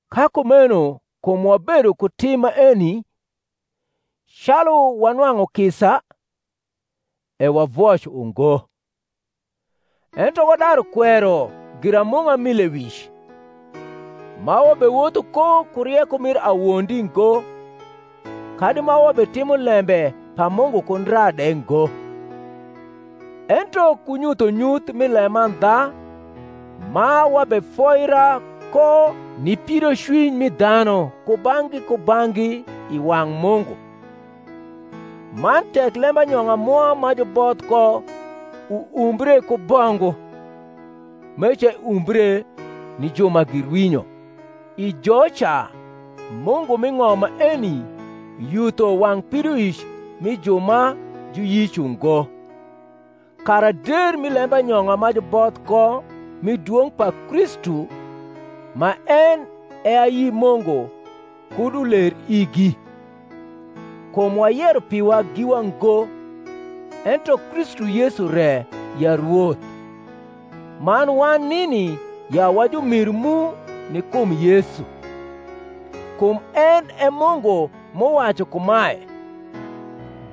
Ka kumeno kum wabedo ku tim maeni, calu wanwang’u kisa, e wavoc ungo: ento wadaru kwero giramung’a mi lewic, ma wabewotho ko ku rieko mir awondi ngo, kadi ma wabetimo lembe pa Mungu ku ndra de ngo; ento ku nyuthonyuth mi lemandha ma wabefoira ko ni pidocwiny mi dhanu kubang’gi kubang’gi i wang’ Mungu. Man tek lembanyong’a mwa ma juboth ko uumbre ku bongu, meca eumbre ni ju ma girwinyo: i joca mungu mi ng’om maeni yutho wang’ pidoic mi ju ma juyic ungo, kara der mi lembanyong’a ma juboth ko mi dwong’ pa Kristu, ma en e ayi Mungu kud uler igi. Kum wayero piwa giwa ngo, ento Kristu Yesu re ya Rwoth, man wan nini ya jumiru mu ni kum Yesu. Kum en e Mungu m’uwacu kumae,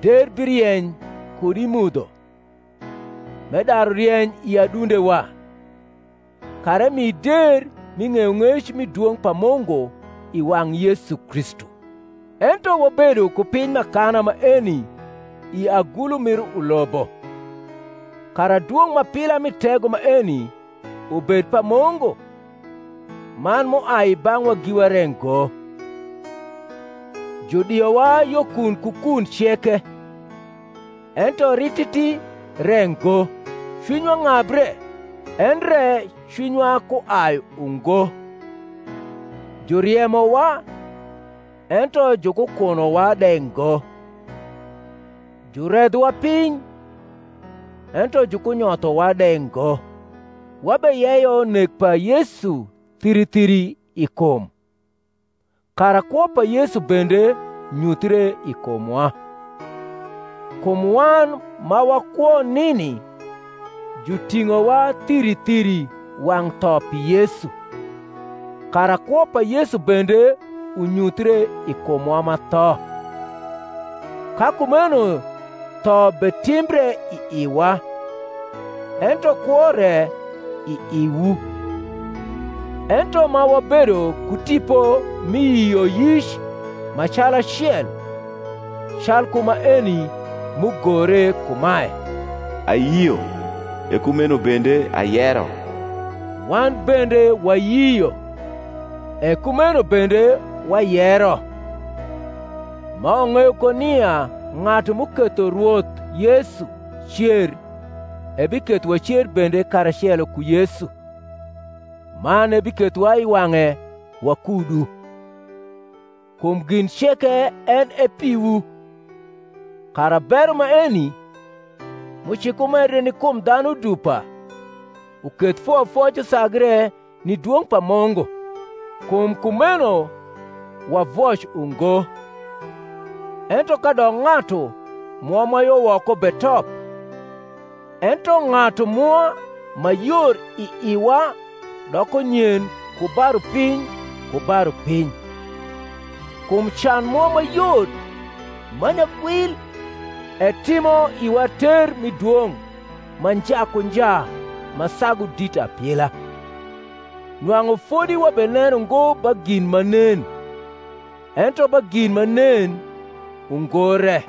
Der birieny kud i mudho, m’edaru rieny i adundewa, kara emi der mi ng’eyong’ec mi dwong’ pa Mungu i wang’ Yesu Kristu. Ento wabedo ku piny m’akana maeni i agulu mir ulobo, kara dwong’ m’apila mi tego maeni ubed pa Mungu, man m’uai i bang’wa giwa re ngo; judiowa yo kun ku kun ceke, ento rititi re ngo; cwinywa ng’abre, endre cwinywa kuai ungo; juriemowa, ento jukukunowa de ngo; juredhowa piny, ento jukunyothowa de ngo; wabeyeyo nek pa Yesu thiri thiri i kum, kara kwo pa Yesu bende nyuthre i kumwa. Kum wan ma wakwo nini juting’owa thiri thiri wang’ tho pi Yesu, kara kwo pa Yesu bende unyuthre i kumwa ma tho. Ka kumeno tho betimbre i iwa, ento kwo re i iwu. Ento ma wabedo ku tipo mi yioyic ma calacel, calku maeni m’ugore kumae, Ayio, e kumeno bende ayero; wan bende wayio, e kumeno bende wayero; ma wang’eyo ko nia ng’atu m’uketho Rwoth Yesu cer ebiketho wacer bende karacelo ku Yesu, man ebikethowa i wang’e wakudu. Kum gin ceke en e piwu, kara bero maeni, m’ucikumedre ni kum dhanu dupa, uketh foyofoc usagre ni dwong’ pa Mungu. Kum kumeno wavoc ungo; ento kadok ng’atu mwa ma yo woko betop, ento ng’atu mwa ma yor i iwa doko nyen ku ba rupiny ku ba rupiny. Kum can mwa ma yot, ma nyagwil, etimo iwa ter mi dwong’ ma nja ku nja ma sagu dit apila; nwang’u fodi wabeneno ngo ba gin ma nen, ento ba gin ma nen ungo re: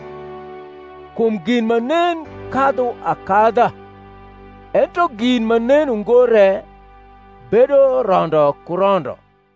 kum gin ma nen kadhu akadha; ento gin ma nen ungo re bedo rondo ku rondo.